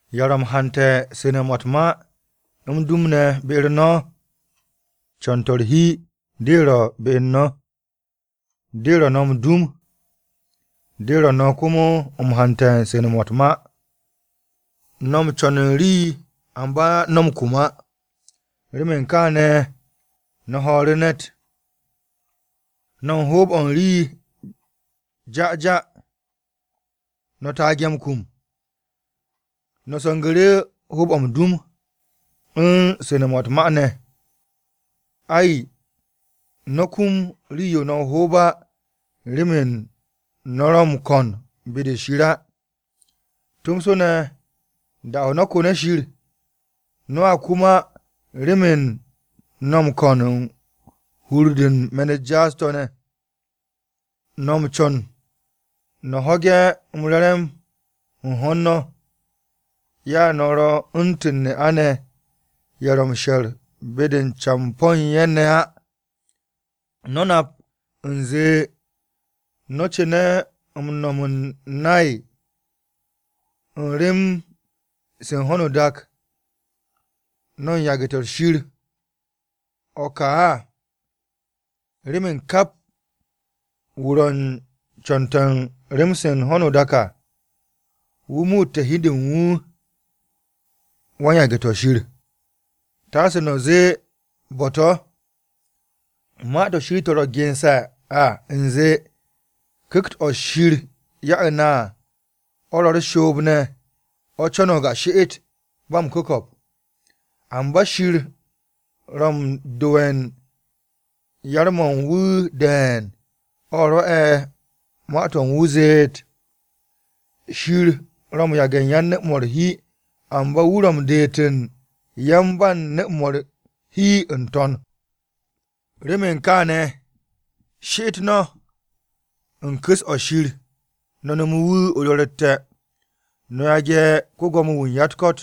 ¿Ya ro̱ m-hante̱ su̱ne̱-mo̱ u̱t-ma m-dum ne̱ be u̱n no̱? Co̱n-to̱ u̱r-hi de ro̱ be u̱n no̱, de ro̱ no̱ m-dum, de ro̱ no̱ komo m-hante̱ su̱ne̱-mo̱ u̱t-ma. No̱ m-co̱n u̱n rii amba no̱ kum á, remen kaane̱ no̱ ho̱o̱ru̱ ne̱t. No̱ u̱n ho̱o̱b u̱n rii ja'ja, no̱ taage̱ m-kum, no̱ se̱ngu̱ru̱ hoob-o̱ m-dum u̱n su̱ne̱-mo̱ u̱t-ma ne̱. Ai, no̱ kum rii-yo no̱ o-hoob á remen no̱ ro̱ m-ko̱n be-de Shir á. Tomso ne̱ da-o̱ no̱ ko̱ne̱ Shir, no̱a kum á remen no̱ m-ko̱n u̱n hur-de u̱n me̱n-u̱t jaas-to̱ ne̱. No̱ m-co̱n no̱ ho̱ge̱ m-re̱re̱m u̱n ho̱n no̱. Ya no̱ ro̱ u̱ntu̱n ne'a-ne̱ ye̱ ro̱ m-she̱r be-de u̱n campo̱ u̱n ye̱ ne̱ á. No̱ nap u̱nze no̱ cu̱ne̱ m-no̱m m-nay u̱n rem-se u̱n ho̱no o-dak, no̱ u̱n yage̱-to̱ Shir o̱ ka à. Remen kap wu̱ ro̱ u̱n co̱n-to̱ u̱n rem-se ho̱no o-dak à, wu̱ muutte̱ hi u̱n de u̱n wu̱, wan-yage̱-to̱ Shir. Taase no̱ zee bo̱-to̱, Ma-to̱ Shir to̱ ro̱ gense̱ à u̱nze, “Ku̱kt-o̱ Shir ya'e̱ na à, o̱ ro̱ u̱r-shoob ne̱, o̱ co̱no̱g a she'et ba m-ku̱ko̱p.” Amba Shir ro̱ na m-do'e̱ u̱n yar-mo̱ u̱n wu̱ de̱e̱n. O̱ rwo̱'e̱ Ma-to̱ u̱n wu̱ zeet, “Shir ro̱ m-yage̱ u̱n yan-nu̱-mo̱ u̱r-hi. Amba wu̱ ro̱ m-deet u̱n yan-ba-nu̱-mo̱ u̱r-hi n-to̱n.” Remen kaane̱, she'et no̱ u̱n ku̱s-o̱ Shir no̱ nome̱ wu̱ o-do̱ro̱tte̱. No̱ yage̱ ko-Gwo̱mo-wu̱ u̱n ya-u̱t-ko̱t,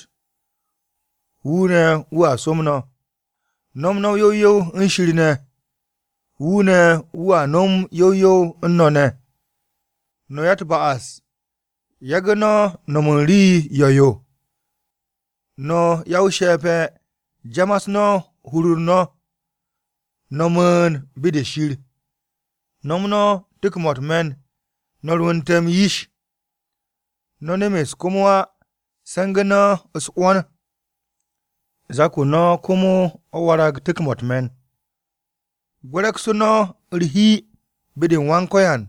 wu̱ ne̱ wu̱a som no̱. No̱m no̱ yow yow u̱n Shir ne̱. Wu̱ ne̱ wu̱a nom yow yow u̱n no̱ ne̱. No̱ ya-u̱t-ba'as, yagu̱ no̱ no̱m u̱n rii yo̱-yo. No̱ ya-o-she̱pe̱, jamas no̱ hur u̱n no̱, no̱ mu̱u̱n be-de Shir. No̱m no̱ tu̱k-mo̱ u̱t-me̱n, no̱ rwu̱nte̱ m-yish. No̱ nemes komo á, se̱ngu̱ no̱ u̱s-'wo̱n. Zak-o no̱ komo o̱ warag tu̱k-mo̱ u̱t-me̱n. Gwe̱re̱ksu̱ no̱ u̱r-hi be-de u̱n Wan-Ko̱yan,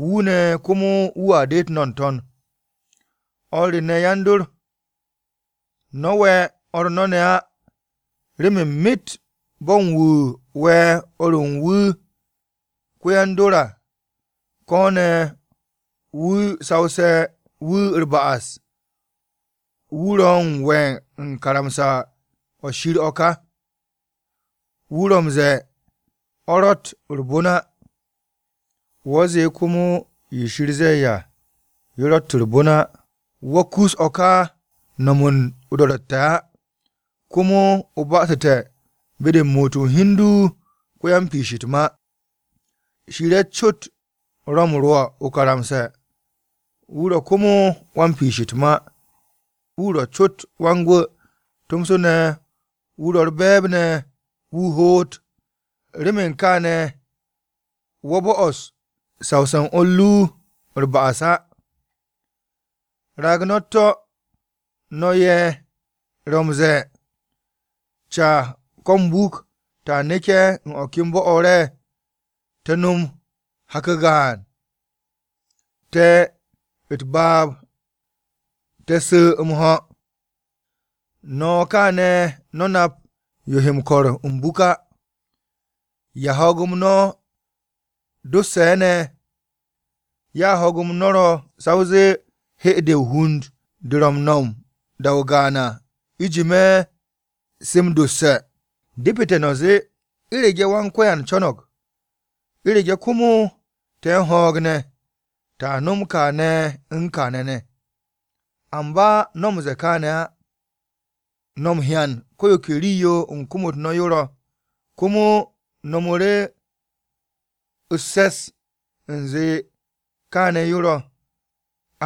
wu̱ ne̱ komo wu̱a deet no̱ n-to̱n. O̱r re ne̱ yan-dor, no̱ we̱ o̱r no̱ ne̱ á. Remen myet bo̱ u̱n wu̱ we̱ o̱r u̱n wu̱ ko-yan-dor à, ko̱ ne̱ wu̱ sawse̱ wu̱ u̱r-ba'as, wu̱ ro̱ u̱n we̱ u̱n karamsa-o̱ Shir o̱ ka. Wu̱ ro̱ m-ze̱e̱ o̱ ro̱tt u̱r-bon á. Wo̱ zee komo yo Shir ze̱e̱ à yo ro̱tt u̱r-bon á, wo̱ kus o̱ ka m-no̱m u̱n o-do̱ro̱tte̱ á. Komo o ba'asu̱te̱ be-de u̱n muut u̱n hi u̱n du ko-yan-piish o̱ u̱t-ma. Shir ye̱ cot ro̱ u̱n rwo̱ o-karamsa. Wu̱ ro̱ komo wan-piish u̱t-ma. Wu̱ ro̱ cot wan-Gwu̱, tomso ne̱ wu̱ ro̱ u̱r-be̱e̱b ne̱ wu̱ hoot. Remen kaane̱, wo̱ bo'os sawse̱ u̱n o̱r ru u̱r-ba'as á. Raag no̱ u̱t-to̱! No̱ ye̱ ro̱ m-ze̱e̱, “Ca ko̱ m-buk ta neke̱ u̱n o̱ ka bo̱-o̱ re̱, te̱ no̱m hak-o gaan, te̱ u̱t-baab te̱ su̱ m-ho̱.” No̱ kaane̱ no̱ nap yo he m-ko̱r m-buk á. ¿Ya-ho̱o̱g-m no̱ dosse̱ ne̱? Ya ho̱o̱g no̱ ro̱ sa o zee 'hye-de o-hund, de ro̱ m-nom da-o gaan à, u̱jime̱ se m-dosse̱. Depete̱ no̱ zee, “U̱rege̱ Wan-Ko̱yan co̱no̱g, u̱rege̱ komo te̱ u̱n ho̱o̱g ne̱, ta nom kaane̱ u̱n kaane̱ ne̱.” Amba no̱ m-ze̱e̱ kaane̱ á. No̱ m-hyan ko̱ yo ke rii-yo u̱n kom-u̱t no̱ yo ro̱, komo no̱mu̱ru̱ u̱s-se̱s u̱nze kaane̱ yo̱ ro̱.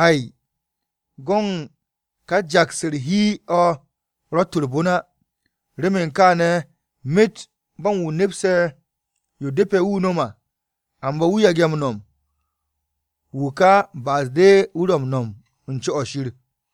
Ai, go̱n ka jaks u̱r-hi o̱ ro̱tt u̱r-bon á. Remen kaane̱, myet bo̱ u̱n wu̱ nepse̱ yo depe̱ wu̱ nom à, amba wu̱ yage̱ m-nom, wu̱ ka ba'as-de wu̱ ro̱ m-no̱m u̱n co-o̱ Shir.